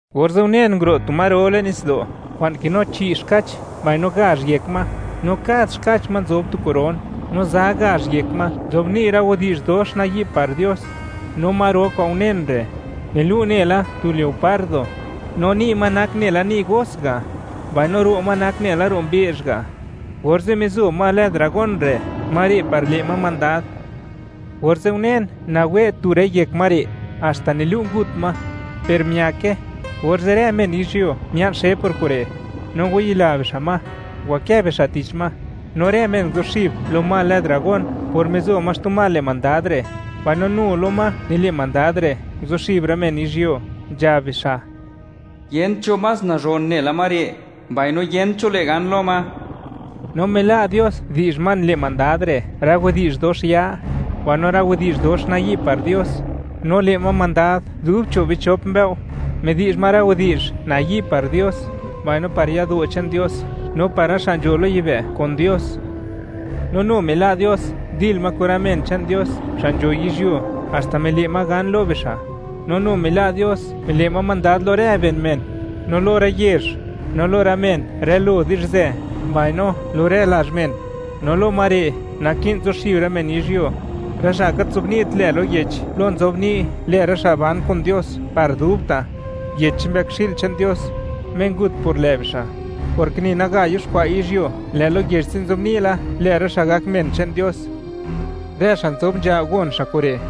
Orze' unen nguro' tu ma ro le'n nitsdo', kwa'n kinu chi' xkach, mbaino gazh yek ma, no kad xkach ma nzob tu koron, no za gazh yek ma nzobni' rë widi'zh dox nayi' par Dios. No ma ro kwa'n unen re', nilu' nela tu leopardo, no ni' ma nak nela ni' os ga', mbaino ro' ma nak nela ro' mbe'zh ga'. Orze' mizo ma lë dragón re' ma re' par le' ma mandad. Orze' unen, nawe' tu rë yek ma re', haxta nilu' ngut ma; per miake, orze' rë men yizhyuo mia'n xe por kure', no ngwayila bixa' ma, ngwakë bixa' tich ma, no rë men nguzuxib lo ma lë dragón por mizo ma xtu ma le' mandad re', mbaino nu lo ma nile' mandad re' nguzuxib rë men yizhyuo, nzhab bixa': ―Yent cho más nazhon nela ma re', mbaino yent cho le' gan lo ma. No mila' Dios, di'zh ma nile' mandad re', rë widi'zh dox ya, mbaino rë widi'zh dox nayi' par Dios, no le' ma mandad dub cho' bichop mbëo'. Midi'zh ma rë widi'zh nayi' par Dios, mbaino par yado' che'n Dios, no par rë xa' nzho lo yibë' kun Dios. No nu mila' Dios ndil ma kun rë men che'n Dios xa' nzho yizhyuo, haxta mile' ma gan lo bixa'; no nu mila' Dios mile' ma mandad lo rë ben men, no lo rë yezh, no lo rë men rë lo di'zhzë, mbaino lo rë lazh men; no lo ma re', naki'n zuxib rë men yizhyuo; rë xa' gat nzobni't lë lo yech plo nzobni' lë rë xa' ban kun Dios par dubta', yech che'n Mbëkxi'l che'n Dios, Me ngut por lë' bixa'; porke ni naga yuxkwa' yizhyuo, lë' lo yech ze' nzobni' la, lë rë xa' gak men che'n Dios. Rë xa' nzob nzha, gon xa' kure':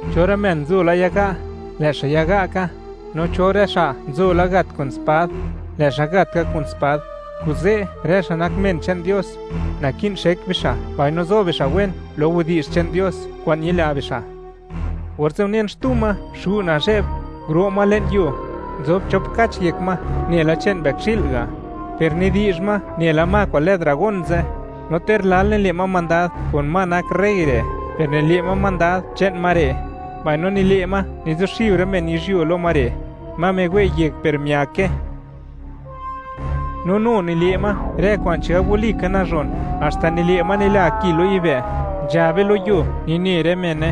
Cho rë men nzo la yaga', lë' xa' yaga' ka; no cho rë xa' nzo la gat kun spad, lë' xa' gat ka kun spad. Kuze', rë xa' nak men che'n Dios, naki'n xek bixa', mbaino zo bixa' wen lo widi'zh che'n Dios kwa'n ñila bixa'. Orze' unen xtu ma xu' nazhe'b, nguro' ma le'n yuo; nzob chop kach yek ma nela che'n mbëkxi'l ga', per nidi'zh ma nela ma kwa'n lë dragón ze'. No ter lal nile' ma mandad kun ma nak rey re', per nile' ma mandad che'n ma re', mbaino nile' ma nizuxib rë men yizhyuo lo ma re', ma miwe' yek per miake. No nu nile' ma rë kwa'n chigab walika nazhon, haxta nile' ma nila ma ki lo yibë', nzhabe lo yuo, nine rë mene.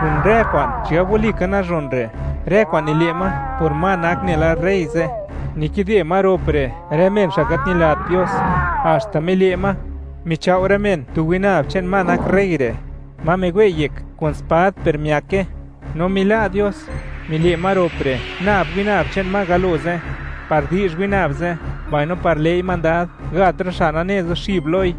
Kun rë kwa'n chigab walika nazhon re', rë kwa'n nile' ma por ma nak nela rey ze', nikide ma rop re' rë men xa' gat ñilat Dios, haxta mile' ma, michao' rë men tu winab che'n ma nak rey re', ma miwe' yek kun spad per miake. No mila' Dios, mile' ma rop re' nab winab che'n ma galo ze', par di'zh winab ze', mbaino par le'i mandad gat rë xa' nane zuxib loi;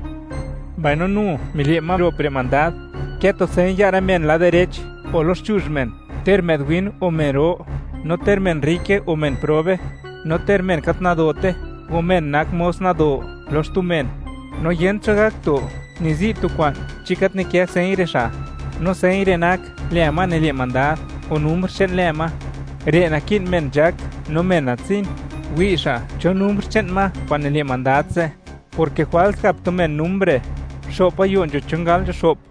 mbaino nu mile' ma rop re' mandad, kë tu señ ya' rë men lad direch o loxchuzh men, ter më'd win or men ro, no ter men rrike o men probe, no ter men gat nadote o men nak mos mido lo xtu men. No yent cho gak to ni zi' tu kwa'n chi gat nikë señ re' xa'; no señ re' nak lë ma nile' mandad, o numr che'n lë ma. Re' naki'n men nzhak no men natsin, wi' xa' cho numr che'n ma kwa'n nile' mandad ze', porke jwals gap tu men numr re': xo'p gayo' nzho chon gal nzho xo'p.